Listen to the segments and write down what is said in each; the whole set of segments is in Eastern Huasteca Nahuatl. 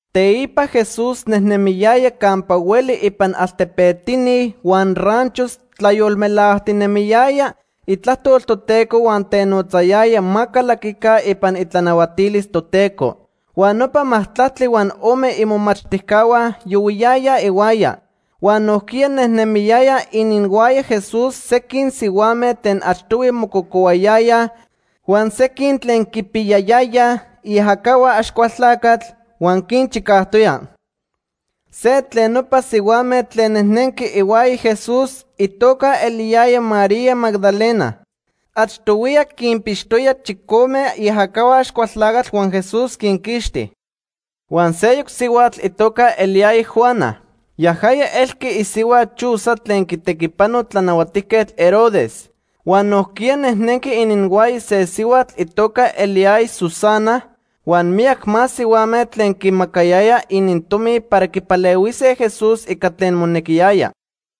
Teipa Jesús nejnemiyaya campa hueli ipan altepetini huan ranchos tlayolmelajtinemiyaya itlajtol Toteco huan tenotzayaya ma calaquica ipan itlanahuatilis Toteco. Huan nopa majtlactli huan ome imomachtijcahua yohuiyayaj ihuaya. Huan nojquiya nemiyayaj ininhuaya Jesús sequin sihuame tlen achtohui mococohuayayaj huan sequin tlen quipiyayaya iajacahua Axcualtlacatl, huan quinchicajtoya. Se tlen nopa sihuame tlen nejnenqui ihuaya Jesús itoca eliyaya María Magdalena. Achtohuiya quinpixtoya chicome iajacahua Axcualtlacatl huan Jesús quinquixti. Huan seyoc sihuatl itoca eliyaya Juana. Yajaya elqui isihua Chuza tlen quitequipano Tlanahuatijquetl Herodes. Huan nojquiya nejnenqui ininhuaya se sihuatl itoca eliyaya Susana, huan miyac más sihuame tlen quimacayayaj inintomi para quipalehuise Jesús ica tlen monequiyaya.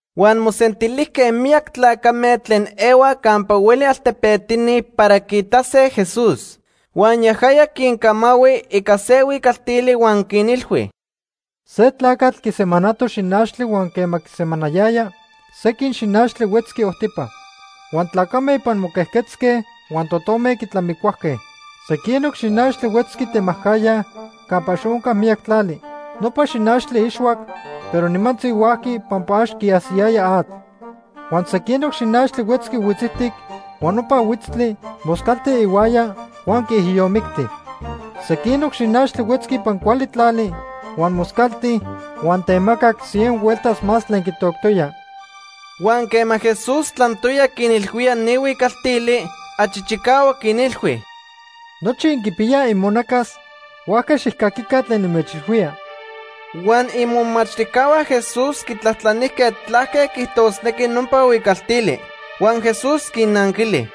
Huan mosentilijque miyac tlacame tlen ehuaj campa hueli altepetini para quiitase Jesús. Huan yajaya quincamahui ica se huicaltili huan quinilhui: “Se tlacatl quisemanato xinachtli huan quema quisemanayaya, sequin xinachtli huetzqui ojtipa. Huan tlacame ipan moquejquetzque huan totome quitlamicuajque. Sequinoc xinachtli huetzqui temajcajya campa ax onca miyac tlali. Nopa xinachtli ixhuac, pero nimantzi huajqui pampa ax quiajsiyaya atl. Huan sequinoc xinachtli huetzqui huitzijtic, huan nopa huitztli moscalti ihuaya huan quiijiyomicti. Sequinoc xinachtli huetzqui ipan cuali tlali, huan moscalti huan temacac cien hueltas más tlen quitoctoya.” Huan quema Jesús tlantoya quinilhuía ni huicaltili, achi chicahuac quinilhui: “Nochi inquipiyaj imonacas, huajca xijcaquica tlen nimechilhuía.” Huan imomachtijcahua Jesús quitlajtlanijque tlaque quiijtosnequi nopa huicaltili. Huan Jesús quinnanquili: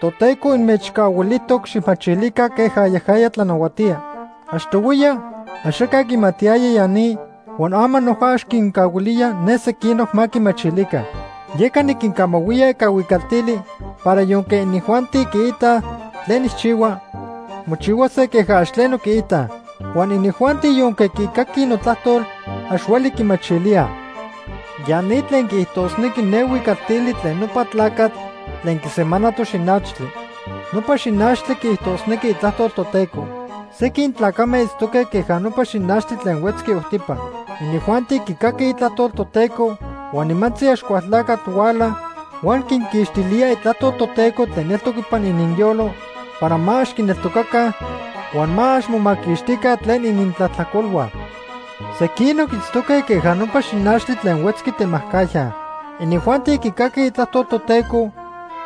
“Toteco inmechcahuilijtoc xijmachilica queja yajaya tlanahuatía. Achtohuiya axaca quimatiyaya ya ni huan ama noja ax quincahuilía ne sequinoc ma quimachilica. Yeca niquincamahuía ica huicaltili para yonque inijuanti quiitaj tlen nijchihua, mochihuase queja ax tleno quiitaj. Huan inijuanti yonque quicaquij notlajtol, ax hueli quimachilíaj. “Ya ni tlen quiijtosnequi ne huicaltili tlen nopa tlacatl tlen quisemanato xinachtli. Nopa xinachtli quiijtosnequi itlajtol Toteco. Sequin tlacame itztoque queja nopa xinachtli tlen huetzqui ojtipa. Inijuanti quicaquij itlajtol Toteco, huan nimantzi Axcualtlacatl huala huan quinquixtilía itlajtol Toteco tlen eltoc ipan ininyolo para ma ax quineltocaca huan ma ax momaquixtica tlen inintlajtlacolhua. Sequinoc itztoque queja nopa xinachtli tlen huetzqui temajcajya. Inijuanti quicaquij itlajtol Toteco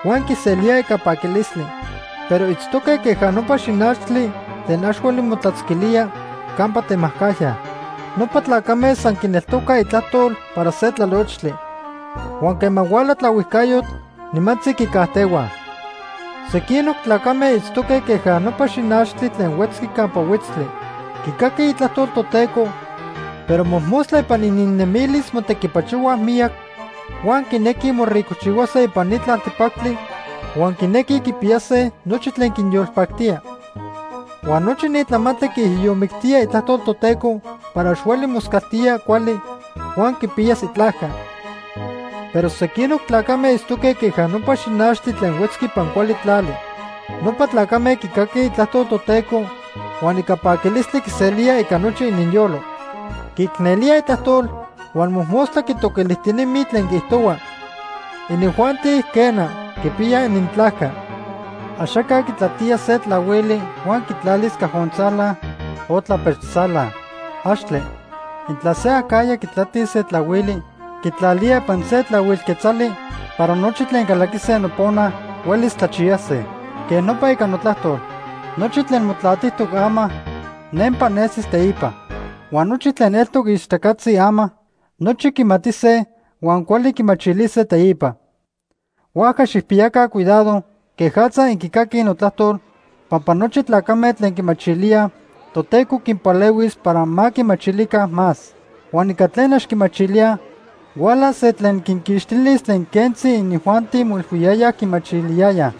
huan quiselíaj ica paquilistli. Pero itztoque queja nopa xinachtli tlen ax hueli motlatzquilía campa temajcajya. Nopa tlacame san quineltocaj itlajtol para se tlalochtli. Huan quema huala tlaohuijcayotl, nimantzi quicajtehuaj. Sequinoc tlacame itztoque queja nopa xinachtli tlen huetzqui campa huitztli. Quicaquij itlajtol Toteco, pero mojmostla ipan ininnemilis motequipachohuaj miyac, huan quinequij moricojchihuase ipan ni tlaltepactli huan quinequij quipiyase nochi tlen quinyolpactía. Huan nochi ni tlamantli quiijiyomictía itlajtol Toteco para ax hueli moscaltía cuali huan quipiyas itlajca. Pero sequinoc tlacame itztoque queja nopa xinachtli tlen huetzqui ipan cuali tlali. Nopa tlacame quicaquij itlajtol Toteco huan ica paquilistli quiselíaj ica nochi ininyolo. Quiicnelíaj itlajtol huan mojmostla quitoquilijtinemij tlen quiijtohua. Inijuanti, quena, quipiyaj inintlajca. “Axaca quitlatía se tlahuili huan quitlalis cajontzala o tlapechtzala. ¡Axtle! Intla se acajya quitlatis se tlahuili, quitlalía ipan se tlahuil quetzali para nochi tlen calaquise nopona huelis tlachiyase. Quej nopa ica notlajtol. Nochi tlen motlatijtoc ama, nempa nesis teipa. Huan nochi tlen eltoc ixtacatzi ama, nochi quimatise huan cuali quimachilise teipa. “Huajca xijpiyaca cuidado quejatza inquicaquij notlajtol, pampa nochi tlacame tlen quimachilíaj, Toteco quinpalehuis para ma quimachilica más. Huan ica tlen ax quimachilíaj, hualas se tlen quinquixtilis tlen quentzi inijuanti moilhuiyayaj quimachiliyayaj.”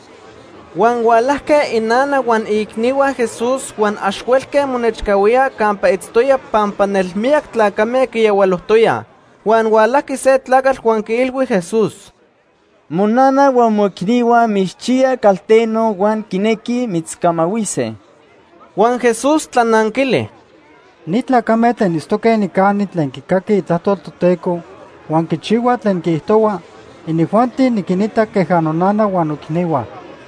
Huan hualajque inana huan iicnihua Jesús huan ax huelque monechcahuíaj campa itztoya pampa nelmiyac tlacame quiyahualojtoyaj. Huan hualajqui se tlacatl huan quiilhui Jesús: ―Monana huan moicnihua mitzchiyaj calteno huan quinequij mitzcamahuise. Huan Jesús tlananquili: ―Ni tlacame tlen itztoque nicani tlen quicaquij itlajtol Toteco huan quichihuaj tlen quiijtohua, inijuanti niquinita queja nonana huan noicnihua.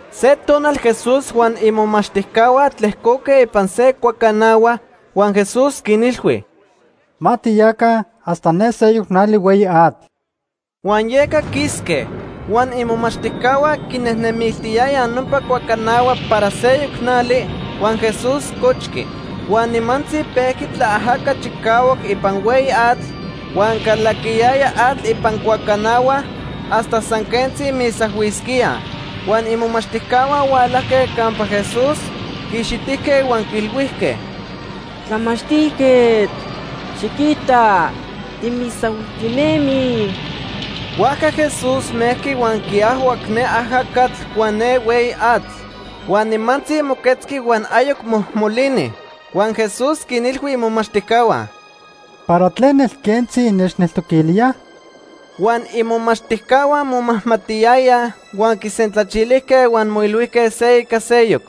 Se tonal Jesús huan imomachtijcahua tlejcoque ipan se cuacanahua, huan Jesús quinilhui: ―Ma tiyaca hasta ne seyoc nali hueyi atl. Huan yeca quisque. Huan imomachtijcahua quinejnemiltiyayaj nopa cuacanahua para seyoc nali, huan Jesús cochqui. Huan nimantzi pejqui tlaajaca chicahuac ipan hueyi atl, huan calaquiyaya atl ipan cuacanahua hasta san quentzi misahuisquíaj. Huan imomachtijcahua hualajque campa Jesús, quiixitijque, huan quiilhuijque: ―Tlamachtijquetl, xiquita, timisahuijtinemij. Huajca Jesús mejqui huan quiajhuac ne ajacatl huan ne hueyi atl. Huan nimantzi moquetzqui huan ayoc mojmolini. Huan Jesús quinilhui imomachtijcahua: ―¿Para tlen nelquentzi innechneltoquilíaj? Huan imomachtijcahua momajmatiyayaj, huan quisentlachilijque huan moilhuijque se ica seyoc: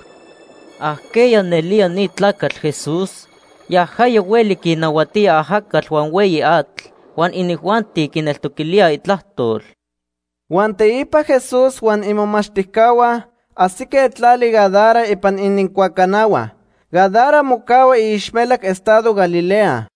―¿Ajqueya nelía ni tlacatl Jesús? Yajaya hueli quinnahuatía ajacatl huan hueyi atl, huan inijuanti quineltoquilíaj itlajtol. Huan teipa Jesús huan imomachtijcahua ajsique tlali Gadara ipan inincuacanahua. Gadara mocahua iixmelac estado Galilea.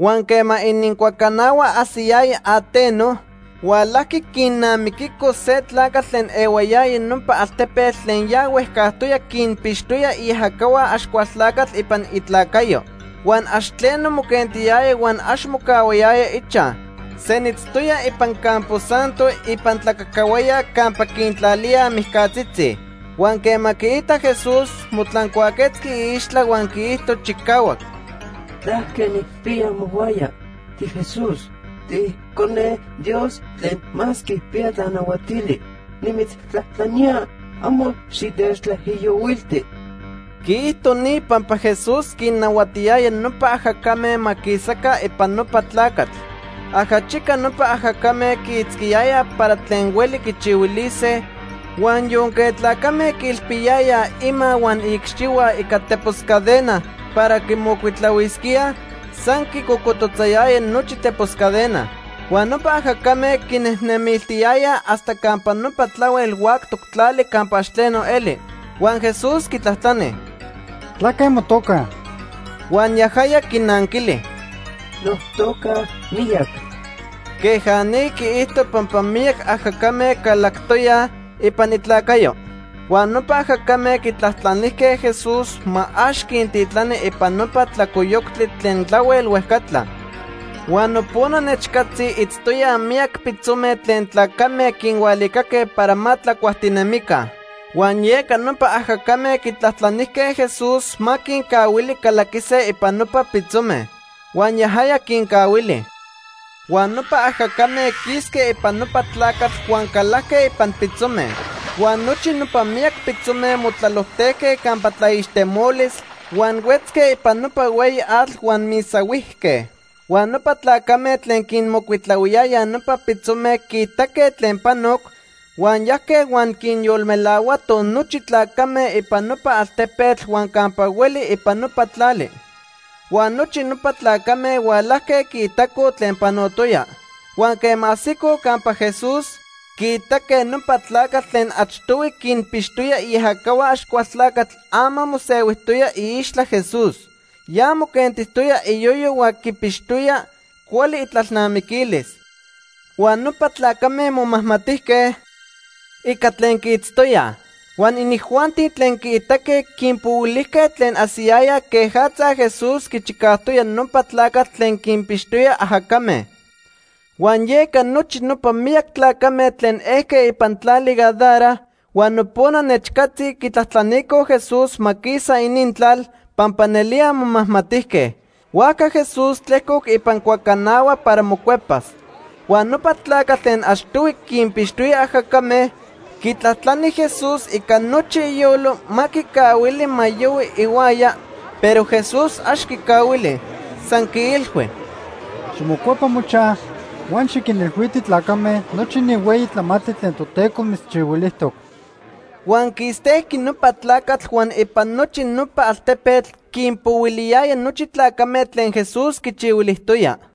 Huan quema inincuacanahua ajsiyaya ateno, hualajqui quinnamiquico se tlacatl tlen ehuayaya nopa altepetl tlen ya huejcajtoya quinpixtoya iajacahua Axcualtlacatl ipan itlacayo. Huan ax tleno moquentiyaya huan ax mocahuayaya ichaj. Senitztoya ipan campo santo ipan tlacacahuaya campa quintlalíaj mijcatzitzi. Huan quema quiitac Jesús, motlancuaquetzqui iixtla huan quiijto chicahuac: ―¿Tlaque nijpiya mohuaya? TiJesús. TiIcone Dios Tlen Más Quipiya Tlanahuatili. Nimitztlajtlanía, amo xitechtlaijiyohuilti. Quiijto ni pampa Jesús quinnahuatiyaya nopa ajacame ma quisaca ipan nopa tlacatl. Ajachica nopa ajacame quiitzquiyayaj para tlen hueli quichihuilise. Huan yonque tlacame quiilpiyayaj ima huan iicxihua ica tepos cadena para quimocuitlahuisquíaj, san quicocototzayaya nochi tepos cadena. Huan nopa ajacame quinejnemiltiyayaj hasta campa nopa tlahuel huactoc tlali campa ax tleno eli. Huan Jesús quitlajtlani: ―¿Tlaque motoca? Huan yajaya quinanquili: ―Notoca Miyac. Queja ni quiijto pampa miyac ajacame calactoyaj ipan itlacayo. Huan nopa ajacame quitlajtlanijque Jesús ma ax quintitlani ipan nopa tlalcoyoctli tlen tlahuel huejcatla. Huan nopona nechcatzi itztoyaj miyac pitzome tlen tlacame quinhualicaque para ma tlacuajtinemica. Huan yeca nopa ajacame quitlajtlanijque Jesús ma quincahuili calaquise ipan nopa pitzome. Huan yajaya quincahuili. Huan nopa ajacame quisque ipan nopa tlacatl huan calajque ipan pitzome. Huan nochi nopa miyac pitzome motlalojtejque campa tlaixtemolis huan huetzque ipan nopa hueyi atl huan misahuijque. Huan nopa tlacame tlen quinmocuitlahuiyayaj nopa pitzome quiitaque tlen panoc, huan yajque huan quinyolmelahuatoj nochi tlacame ipan nopa altepetl huan campa hueli ipan nopa tlali. Huan nochi nopa tlacame hualajque quiitacoj tlen panotoya. Huan quema ajsicoj campa Jesús, quiitaque nopa tlacatl tlen achtohui quinpixtoya iajacahua Axcualtlacatl ama mosehuijtoya iixtla Jesús. Ya moquentijtoya iyoyo huan quipixtoya cuali itlalnamiquilis. Huan nopa tlacame momajmatijque, ica tlen quiitztoyaj. Huan inijuanti tlen quiitaque quinpohuilijque tlen ajsiyayaj quejatza Jesús quichicajtoya nopa tlacatl tlen quinpixtoya ajacame. Huan yeca nochi nopa miyac tlacame tlen ejque ipan tlali Gadara huan nopona nechcatzi quitlajtlanicoj Jesús ma quisa inintlal, pampa nelía momajmatijque. Huajca Jesús tlejcoc ipan cuacanahua para mocuepas. Huan nopa tlacatl tlen achtohui quinpixtoya ajacame, quitlajtlani Jesús ica nochi iyolo ma quicahuili ma yohui ihuaya, pero Jesús ax quicahuili. San quiilhui: ―Ximocuepa mochaj huan xiquinilhuiti tlacame nochi ni hueyi tlamantli tlen Toteco mitzchihuilijtoc. Huan quistejqui nopa tlacatl huan ipan nochi nopa altepetl quinpohuiliyaya nochi tlacame tlen Jesús quichihuilijtoya.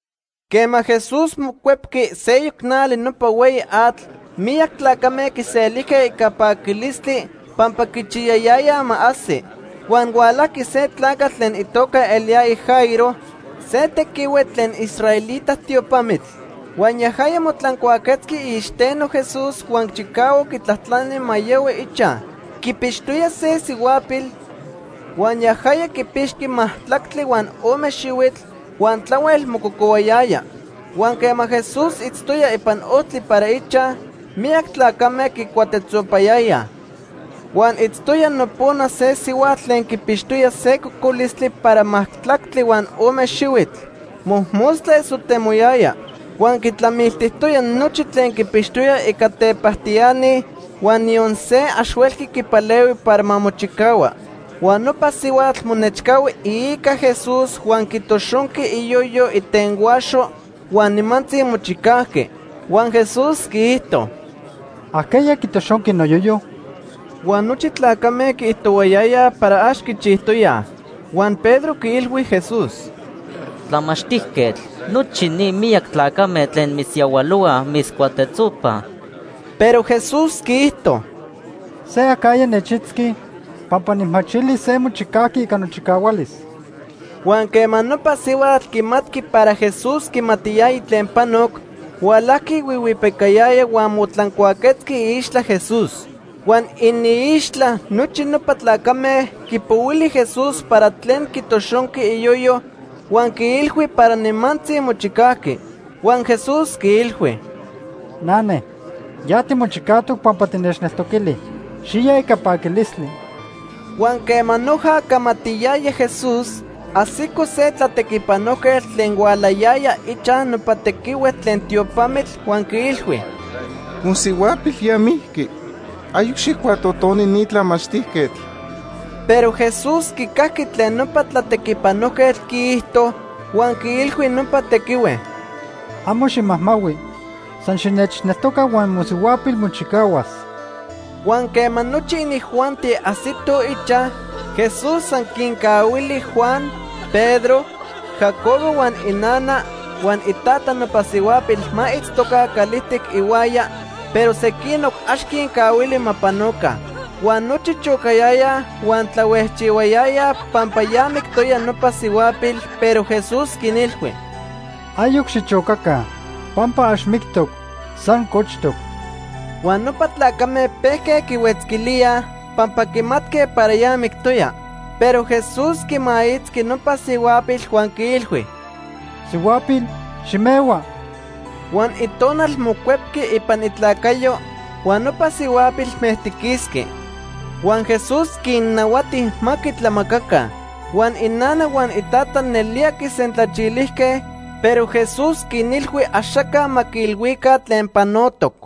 Quema Jesús mocuepqui seyoc nali nopa hueyi atl, miyac tlacame quiselijque ica paquilistli pampa quichiyayayaj ma ajsi. Huan hualajqui se tlacatl tlen itoca eliyaya Jairo, se tequihue tlen israelita tiopamitl. Huan yajaya motlancuaquetzqui iicxiteno Jesús huan chicahuac quitlajtlani ma yahui ichaj. Quipixtoya se isihuapil, huan yajaya quipixqui majtlactli huan ome xihuitl huan tlahuel mococohuayaya. Huan quema Jesús itztoya ipan ojtli para ichaj, miyac tlacame quicuatetzopayayaj. Huan itztoya nopona se sihuatl tlen quipixtoya se cocolistli para majtlactli huan ome xihuitl. Mojmostla esotemoyaya. Huan quitlamiltijtoya nochi tlen quipixtoya ica tepajtiani huan niyon se ax huelqui quipalehui para ma mochicahua. Huan nopa sihuatl monechcahui iica Jesús huan quitoxonqui iyoyo itenhuaxo huan nimantzi mochicajqui. Huan Jesús quiijto: ―¿Ajqueya quitoxonqui noyoyo? Huan nochi tlacame quiijtohuayayaj para ax quichijtoyaj. Huan Pedro quiilhui Jesús: ―Tlamachtijquetl, nochi ni miyac tlacame tlen mitzyahualohuaj mitzcuatetzopaj. Pero Jesús quiijto: ―Se acajya nechitzqui pampa nijmachili se mochicajqui ica nochicahualis. Huan quema nopa sihuatl quimatqui para Jesús quimatiyaya tlen panoc, hualajqui huihuipicayaya huan motlancuaquetzqui iixtla Jesús. Huan iniixtla nochi nopa tlacame quipohuili Jesús para tlen quitoxonqui iyoyo huan quiilhui para nimantzi mochicajqui. Huan Jesús quiilhui: ―Nane, ya timochicajtoc pampa tinechneltoquili. Xiya ica paquilistli. Huan quema noja camatiyaya Jesús, ajsico se tlatequipanojquetl tlen hualayaya ichaj nopa tequihue tlen tiopamitl, huan quiilhui: ―Mosihuapil ya mijqui. Ayoc xijcuatotoni ni tlamachtijquetl. Pero Jesús quicajqui tlen nopa tlatequipanojquetl quiijto huan quiilhui nopa tequihue: ―Amo ximajmahui, san xinechneltoca huan mosihuapil mochicahuas. Huan quema nochi inijuanti ajsitoj ichaj, Jesús san quincahuili Juan, Pedro, Jacobo huan inana huan itata nopa sihuapil ma itztoca calijtic ihuaya, pero sequinoc ax quincahuili ma panoca. Huan nochi chocayayaj huan tlahuejchihuayayaj pampa ya mictoya nopa sihuapil, pero Jesús quinilhui: ―Ayoc xichocaca. Pampa ax mictoc, san cochtoc. Huan nopa tlacame pejque quihuetzquilíaj pampa quimatque para ya mictoya. Pero Jesús quimaitzqui nopa sihuapil huan quiilhui: ―Sihuapil, ximehua. Huan itonal mocuepqui ipan itlacayo huan nopa sihuapil mejtiquisqui. Huan Jesús quinnahuati ma quitlamacaca. Huan inana huan itata nelía quisentlachilijque, pero Jesús quinilhui axaca ma quiilhuica tlen panotoc.